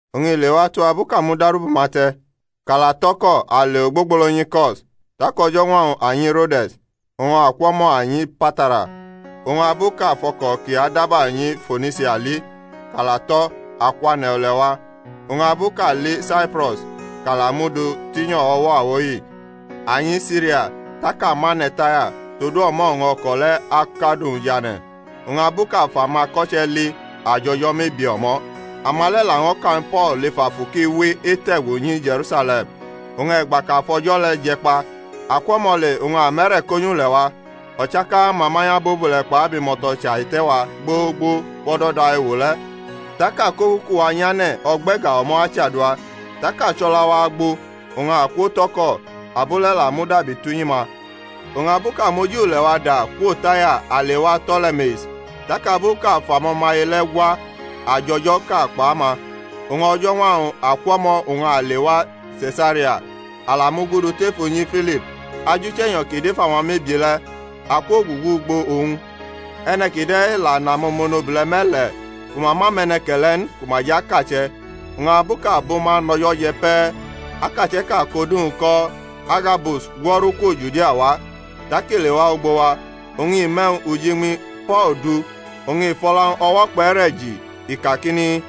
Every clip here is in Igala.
Oñ i lewatu abu kʼa mudaru bʼuma te̩, kʼa la tʼo̩ko a le ogbogbolo nyi Ko̩s, tak o̩jo̩ñwa-wñ a nyi Rode̩s, oñ akwo̩mo a nyi Patara; oñ abu kʼa fʼo̩ko̩ kʼi adaba nyi Fonisia li, kʼa la tʼo, a kwane̩ ule̩-wa. Oñ abu kʼa li Saipro̩s, kʼa la mu dʼu tinyo̩ o̩wo̩ a wo hi, a nyi Siria, tak a mane̩ Taya, todu o̩mo̩ oñ o̩ko̩ le̩ akʼadu-wñ jʼane̩. Oñ abu kʼa fʼamako̩che̩ li a jʼo̩jo̩ mebie o̩mo̩; ama le̩ laño̩ ka ñw Po̩l lef Afu kʼi we ete̩gu nyi Je̩rusale̩m. Oñ e̩gba kʼa fʼo̩jo̩ le̩ je̩ kpa, a kwo̩mo̩ le oñ a mʼe̩re̩ ko nyʼule̩-wa. O̩chaka-ma manyʼabobule̩ kpʼabimo̩to̩ chaihite̩ wa gbogbo wʼo̩do̩da ewo le̩. Tak a kʼokuku-wa nyane̩ ogbe̩ga o̩mo̩ achadua. Tak a chʼo̩la-wa agbo, oñ a kwotʼo̩ko̩, abo le̩ la mudabi tʼunyi-ma. Oñ abu kʼa mʼoji ule̩-wa da kwo̩ Taya a lewa To̩le̩me̩is, tak abu kʼa fʼamo̩maye le̩ gwa, a jʼo̩jo̩ʼka kpʼama. Oñ o̩jo̩ñwa-wñ a kwʼo̩mo̩ oñ a lewa Se̩saria; a la mugudu tef unyi Filip, ajuche̩nyo̩ kʼi dʼef amamebie le̩, a kwogugu ugbo owñ. E̩ne̩ kide̩ la nʼamo̩monobule̩ me̩le̩ ku ma ma mʼe̩ne̩ke̩le̩ n ku ma jʼakache̩. Oñ abu kʼa bʼuma nʼo̩jo̩ je̩ pe̩, akache̩ʼka kʼodu-wñ ko̩ Agabus gwo̩ru kwo Judia wa. Tak i lewa ugbo wa, oñ i mʼe̩wñ ujiñmi Po̩l du oñ i fʼo̩la-wñ o̩wo̩ kpʼe̩re̩ ji, i kakini,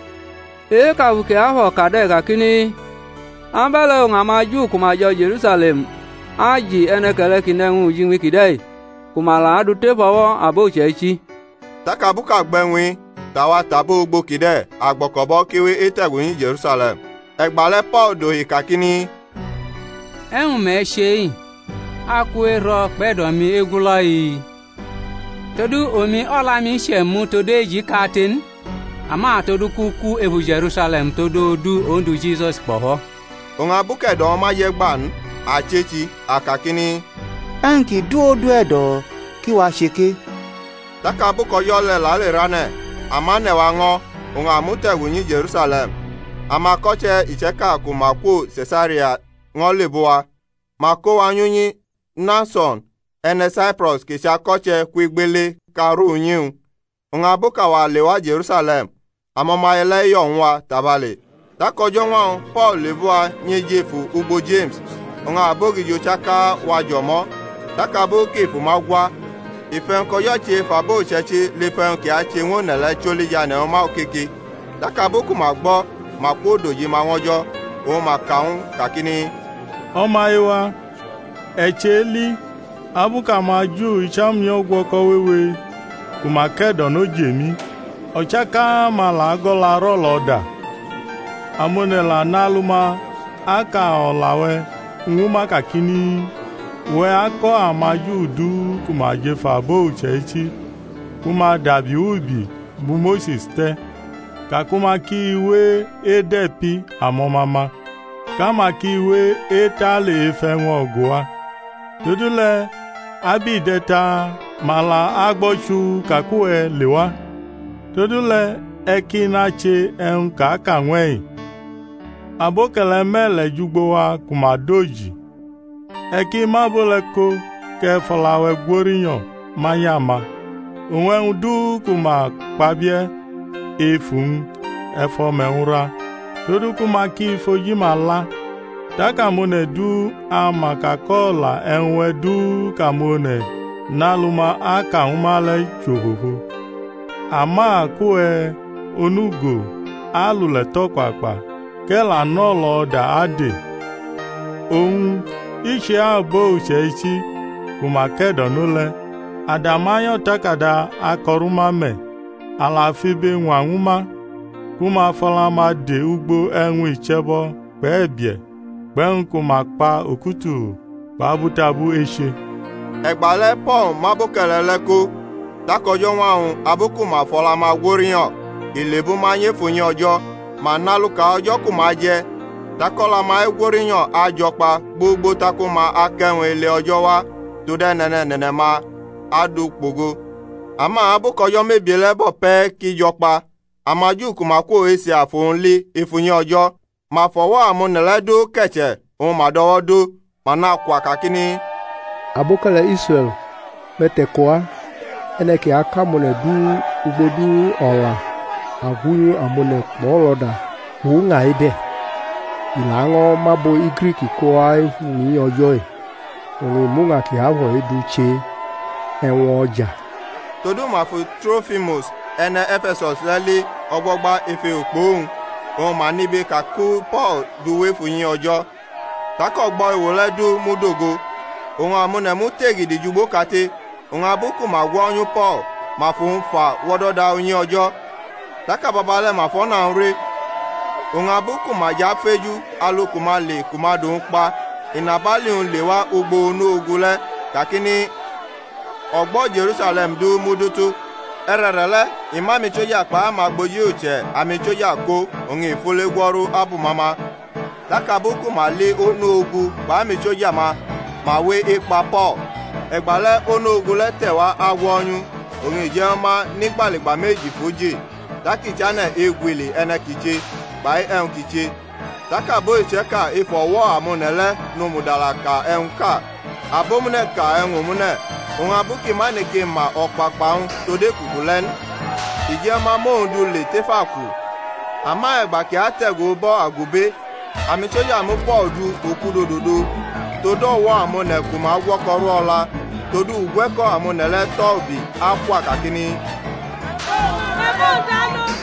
E-kʼAfu Kiafo̩ ka de̩ kakini, Abe̩le̩ oñ amaJu ku ma jo̩ Je̩rusale̩m aji e̩ne̩ke̩le̩ kʼi nʼe̩wñ ujiñmi kide̩ ku ma la adʼu tef o̩wo̩ abo uche̩ichi. Tak abu kʼa gbʼe̩wñ-i, tʼawa tʼabo ugbo kide̩ a gbo̩ko̩bʼo̩ kʼi we ete̩gu nyi Je̩rusale̩m. E̩gbale̩ Po̩l dohi kakini, E̩wñ me̩ che-i? Aku ero̩ kpʼe̩do̩-mi egulo̩-i? Todu omi o̩la-mi che̩mu tod eji kate n ama todu kʼu ku efu Je̩rusale̩m tod odu Ondu Jisus kpo̩fo̩. Oñ abu kʼe̩do̩-wñ ma je̩ gba n, a chechi, a kakini, E̩wñ ki du Ondu e̩do̩ ki wache ke. Tak abu kʼo̩jo̩ le̩ lerʼane̩ a mʼane̩-wa ño̩ oñ a mute̩gu nyi Je̩rusale̩m. Amako̩che̩ iche̩ka ku ma kwo Se̩saria ño̩ lebʼuwa, ma ko wa nyʼunyi Mnason e̩ne̩ Saipro̩s kʼi chʼako̩che̩ kwʼigbele kʼa aru unyi-wñ. Oñ abu kʼawa lewa Je̩rusale̩m, amo̩maye le̩ yo̩ ñw wa tabale̩. Tak o̩jo̩ñwa-wñ Po̩l lebʼuwa nyʼejefu ugbo Jeme̩s; oñ abogijo chaka wajʼo̩mo̩. Tak abu kʼi fʼuma gwa, i fʼe̩wñ kʼO̩jo̩ che ef abo uche̩ichi lef e̩wñ kʼi ache ñw one̩ le̩ choli jʼane̩ ñw ma okoke. Tak abu ku ma gbo̩ ma kwodojima ñw O̩jo̩, oñ ma ka ñw u kakini, O̩maye-wa, e̩ cheli abu kʼamaJu icham nyʼo̩gwo̩ko̩ wewe ku ma ke̩do̩no jʼemi, o̩chaka-ma la go̩laru o̩lo̩da. Amone̩ la nʼalu-ma aka o̩la-we̩ ñw ma kakini, Uwe̩ ako̩ amaJu du ku ma jʼef abo uche̩ichi ku ma dabi wʼubi bu Mose̩s te̩, ka ku ma ki we̩ ede̩pi amo̩ma-ma, kʼama ki we etale ef e̩wñ o̩gu-wa. Todule̩ abʼi de̩ ta? Ma la agbo̩ chuu ka kʼuwe̩ lewa. Todule̩ e̩ ki nache e̩wñ kʼa ka ñwʼe-i. Abo̩ke̩le̩ me̩le̩ jʼugbo wa ku ma dʼoji; e̩ ki mʼabo le̩ ko kʼe̩ fʼo̩la-we̩ gwo rinyo̩ manyʼama; oñ e̩wñ du ku ma kpabie̩ ef uwñ e̩ fʼo̩me̩-wñ ra todu ku ma ki fʼoji-ma la, tak amone̩ du ama ka kʼo̩la e̩wñ-we̩ du kʼamone̩ nʼalu-ma aka ñw ma le̩ chʼofofo, ama kʼuwe̩ onugo alule̩ tʼo̩kpakpa kʼe̩ la nʼo̩lo̩da ade. Oñ i chʼe-abo uche̩ichi ku ma ke̩do̩no le̩, a dama nyʼo̩takada ako̩ rʼuma me̩, a la fʼibe ñwañw ma ku ma fʼo̩la-ma de̩ ugbo e̩wñ iche̩bo̩ kpʼe̩bie̩ kpʼe̩wñ ku ma kpa okutulu kpʼabutabu eche. E̩gbale̩ Po̩l mʼaboke̩le̩ le̩ ko, tak o̩jo̩ñwa-wñ abu kʼu ma fʼo̩la-ma gworinyo̩, i le̩bʼuma nyʼef unyi O̩jo̩, ma nʼaluka o̩jo̩ ku ma aje̩ tak o̩la-ma egwo̩rinyo̩ ajo̩ kpa gbogbo tak uma akʼe̩wñ ele-O̩jo̩ wa tod e̩ne̩ne̩ne̩ne̩ ma adu kpogo. Ama abu kʼo̩jo̩ mebie le̩ bo̩ pe̩ ki jo̩ kpa, amaJu ku ma kwo Esia fʼowñ li ef unyi O̩jo̩, ma fʼo̩wo̩ amone̩ le̩ du ke̩che̩ oñ ma dʼo̩wo̩ dʼo, ma nakwa kakini, Aboke̩le̩ Israe̩l, me̩ te̩ko wa! E̩ne̩ kʼi ako̩ amone̩ du ugbo du o̩la agwunyu amone̩ kpʼo̩lo̩da kpʼuña-i de̩; i laño̩ mʼabo̩ Grik ko wʼef unyi O̩jo̩-i, oñ i mʼuña kiafo̩-i du che e̩wño̩ja. Todu ma fu Trofimus e̩ne̩ E̩fe̩sus le̩ li o̩gbo̩gba ef ewo kpʼowñ, oñ ma nibe ka ku Po̩l dʼu wʼef unyi O̩jo̩. Tak ogbo̩ ewo le̩ du mudogo. Oñ amone̩ mute̩gidi jʼugboʼkate, oñ abu ku ma gwo̩nyu Po̩l, ma fʼowñ fa wʼo̩do̩da unyi O̩jo̩, tak ababale̩ ma fʼo̩na-wñ re. Oñ abu ku ma jʼafeju alu ku ma ale ku ma dʼowñ kpa, inabali-wñ lewa ugbo onu-ogu le̩, kakini, Ogbo̩ Je̩rusale̩m du mudutu. E̩re̩re̩le̩ i mʼamisoja kpai amagboji uche̩ amisoja ko oñ i fule gwo̩ru abʼuma ma: tak abu ku ma li onu-ogu kpʼamisoja-ma, ma we ekpa Po̩l. E̩gbale̩ onu-ogu le̩ te̩wa agwo̩nyʼu, oñ i je̩ ñw ma nʼigbaligba meji fʼu ji; tak i chane̩ egwili e̩ne̩ kʼi che, kpai e̩wñ kʼi che. Tak abo iche̩ka ef o̩wo̩ amone̩ le̩ nʼomudala ka e̩wñʼka, abomune̩ ka e̩wñ omune̩. Oñ abu kʼi ma neke ma o̩kpakpa-wñ tod ekuku le̩ n, i je̩ ñw ma mʼowñ du le tef aku. Ama e̩gba kʼi ate̩gu ubo̩ agube amisoja mu Po̩l du okudododo tod o̩wo̩ amone̩ ku ma gwo̩ko̩ rʼu o̩la; todu ugwe̩ko̩ amone̩ le̩ tʼo̩ ubi akwa kakini, Me̩ mʼowñ du alo!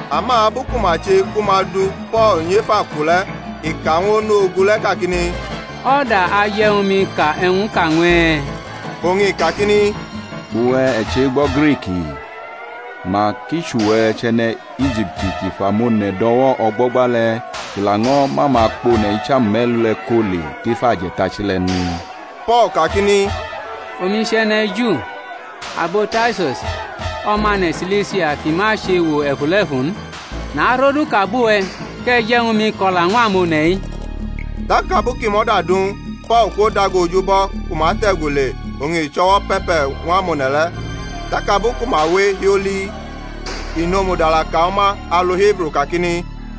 Ama abu ku ma che ku ma du Po̩l nyʼef aku le̩ i ka ñw onu-ogu le̩ kakini, O̩da aje̩ ñw mi ka e̩wñʼka ñw e̩? Oñ i kakini, Uwe̩, e̩ chegbo̩ Griki? Mak i chʼuwe̩ chʼe̩ne̩ Ijipti kʼi fʼamone̩ do̩wo̩ o̩gbo̩gba le̩ kʼi laño̩ mʼamakpone̩ icham me̩lu le̩ ko le tef aje̩tachi le̩ n? Po̩l kakini, Omi chʼe̩ne̩ Ju, abo Tarsus, omane̩ Silisia ki ma chʼewo e̩fule̩fu n. Narʼoduʼka bʼuwe̩, kʼe̩ je̩ ñw mi ko̩la ñw amone̩-i. Tak abu kʼi mʼo̩da du ñwʼu, Po̩l kwodago oj ubo̩ ku ma te̩gu le oñ i chʼo̩wo̩ pe̩pe̩ ñw amone̩ le̩; tak abu ku ma we hioli i nʼomudala ka ñw ma alu Hibru kakini: